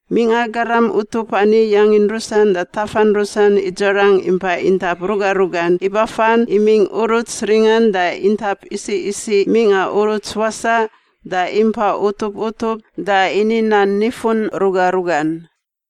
Mingꞌa garam utup ani yangin rusan da tafan rusan idzarang impa intap ruga rugan ibafan imingꞌ uruts ringan da intap isiꞌ isiꞌ mingꞌa uruts wasaꞌ da impa utup utup da ini nan nifun ruga rugan.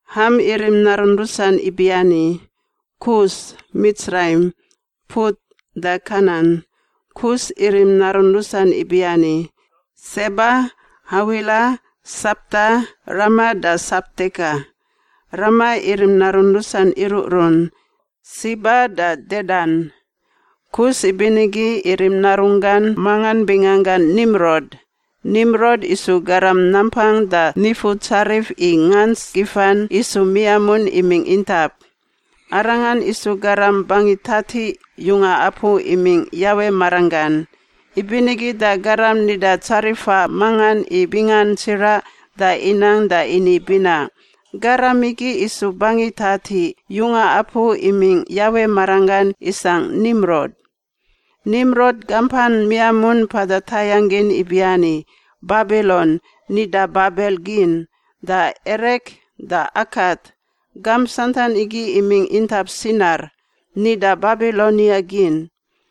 Ham irim narun rusan ibiani: Kus, Mitsraim, Put da Kanan. Kus irim narun rusan ibiani: Seba, Hawila, Sapta, Rama da Sapteka. Rama irim narun rusan iruꞌrun: Siba da Dedan. Kus ibinigi irim narunggan mangan binganggan Nimrod. Nimrod isu garam nampang da nifutsarif i ngants gifan isu miamun imingꞌ intap. Arangan isu garam bangi tatiꞌ yunga apu imingꞌ Yawe maranggan. Ibinigi da garam nida tsarifa mangan i bingan tsiraꞌ, da inang da ini binaꞌ, “Garam igi isu bangi tatiꞌ yunga apu imingꞌ Yawe maranggan isangꞌ Nimrod.” Nimrod gampan miamun mpada tayangꞌ gin ibiani: Babilon (nida Babel gin) da Erek da Akat, gamp santan igi imingꞌ intap Sinar (nida Babilonia gin).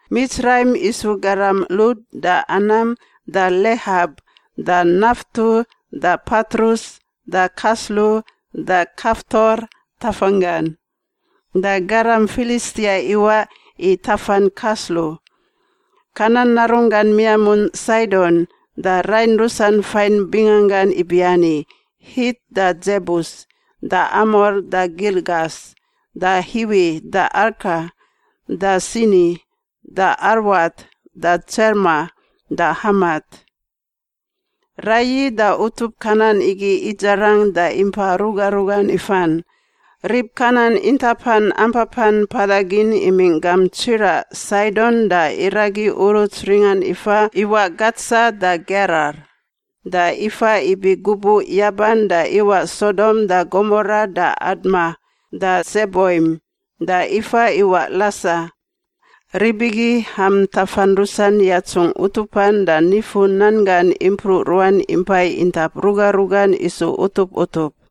Mitsraim isu garam Lud da Anam da Lehap da Naftu da Patrus da Kaslu da Kaftor tafanggan. Da garam Filistia iwaꞌ i tafan Kaslu. Kanan narunggan miamun Saidon, da rain rusan fain binganggan ibiani: Hit da Dzebus da Amor da Girgas da Hiwi da Arka da Sini da Arwat da Tsemar da Hamat. Raiyi da utup Kanan igi idzarang da impa ruga rugan ifan. Rib Kanan intapan ampapan mpada gin imingꞌ gamp tsiraꞌ Saidon da iragi uruts ringan ifa iwaꞌ Gatsa da Gerar da ifa ibi gubuꞌ yaban da iwaꞌ Sodom da Gomora da Adma da Tseboim da ifa iwaꞌ Lasa. Rib igi Ham tafan rusan yatsungꞌ utupan da nifu-nan gan impruꞌ ruan impai intap ruga rugan isu utup utup.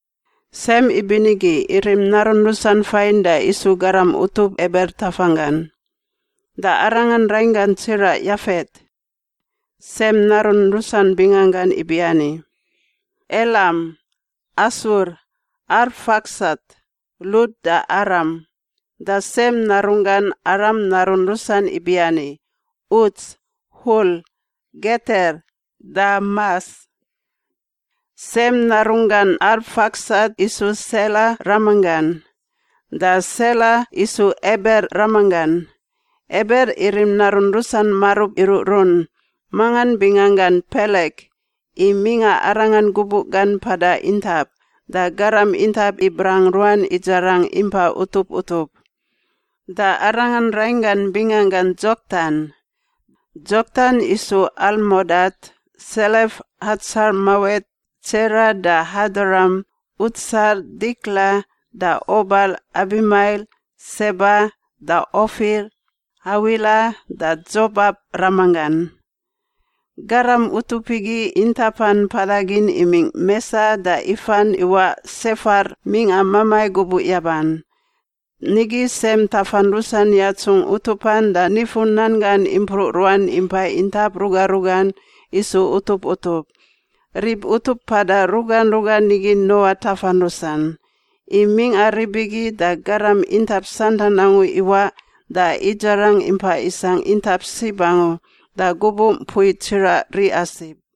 Sem ibinigi irim narun rusan fain da isu garam utup Eber tafanggan, da arangan rainggan tsiraꞌ Yafet. Sem narun rusan binganggan ibiani: Elam, Asur, Arfaksat, Lud da Aram. Da Sem narunggan Aram narun rusan ibiani: Uts, Hul, Geter da Mas. Sem narunggan Arfaksat isu Sela ramanggan, da Sela isu Eber ramanggan. Eber irim narun rusan marub iruꞌrun, mangan binganggan Pelek, i mingꞌa arangan gubuꞌ gan mpada intap, da garam intap ibrang ruan idzarang impa utup utup. Da arangan rainggan binganggan Dzoktan. Dzoktan isu Almodat, Selef, Hatsarmawet, Tsera, da Hadoram, Utsal, Dikla, da Obal, Abimael, Seba, da Ofir, Hawila da Dzobap ramanggan. Garam utup igi intapan mpada gin imingꞌ Mesa da ifan iwaꞌ Sefar mingꞌa mamai gubuꞌ yaban. Nigi Sem tafan rusan yatsungꞌ utupan da nifu-nan gan impruꞌ ruan impai intap ruga rugan isu utup utup. Rib utup mpada ruga rugan igi Noa tafan rusan. I mingꞌa rib igi, da garam intap santan angu iwaꞌ da idzarang impa isangꞌ intap sib angu, da gubuꞌ mpui tsiraꞌ riꞌa sib.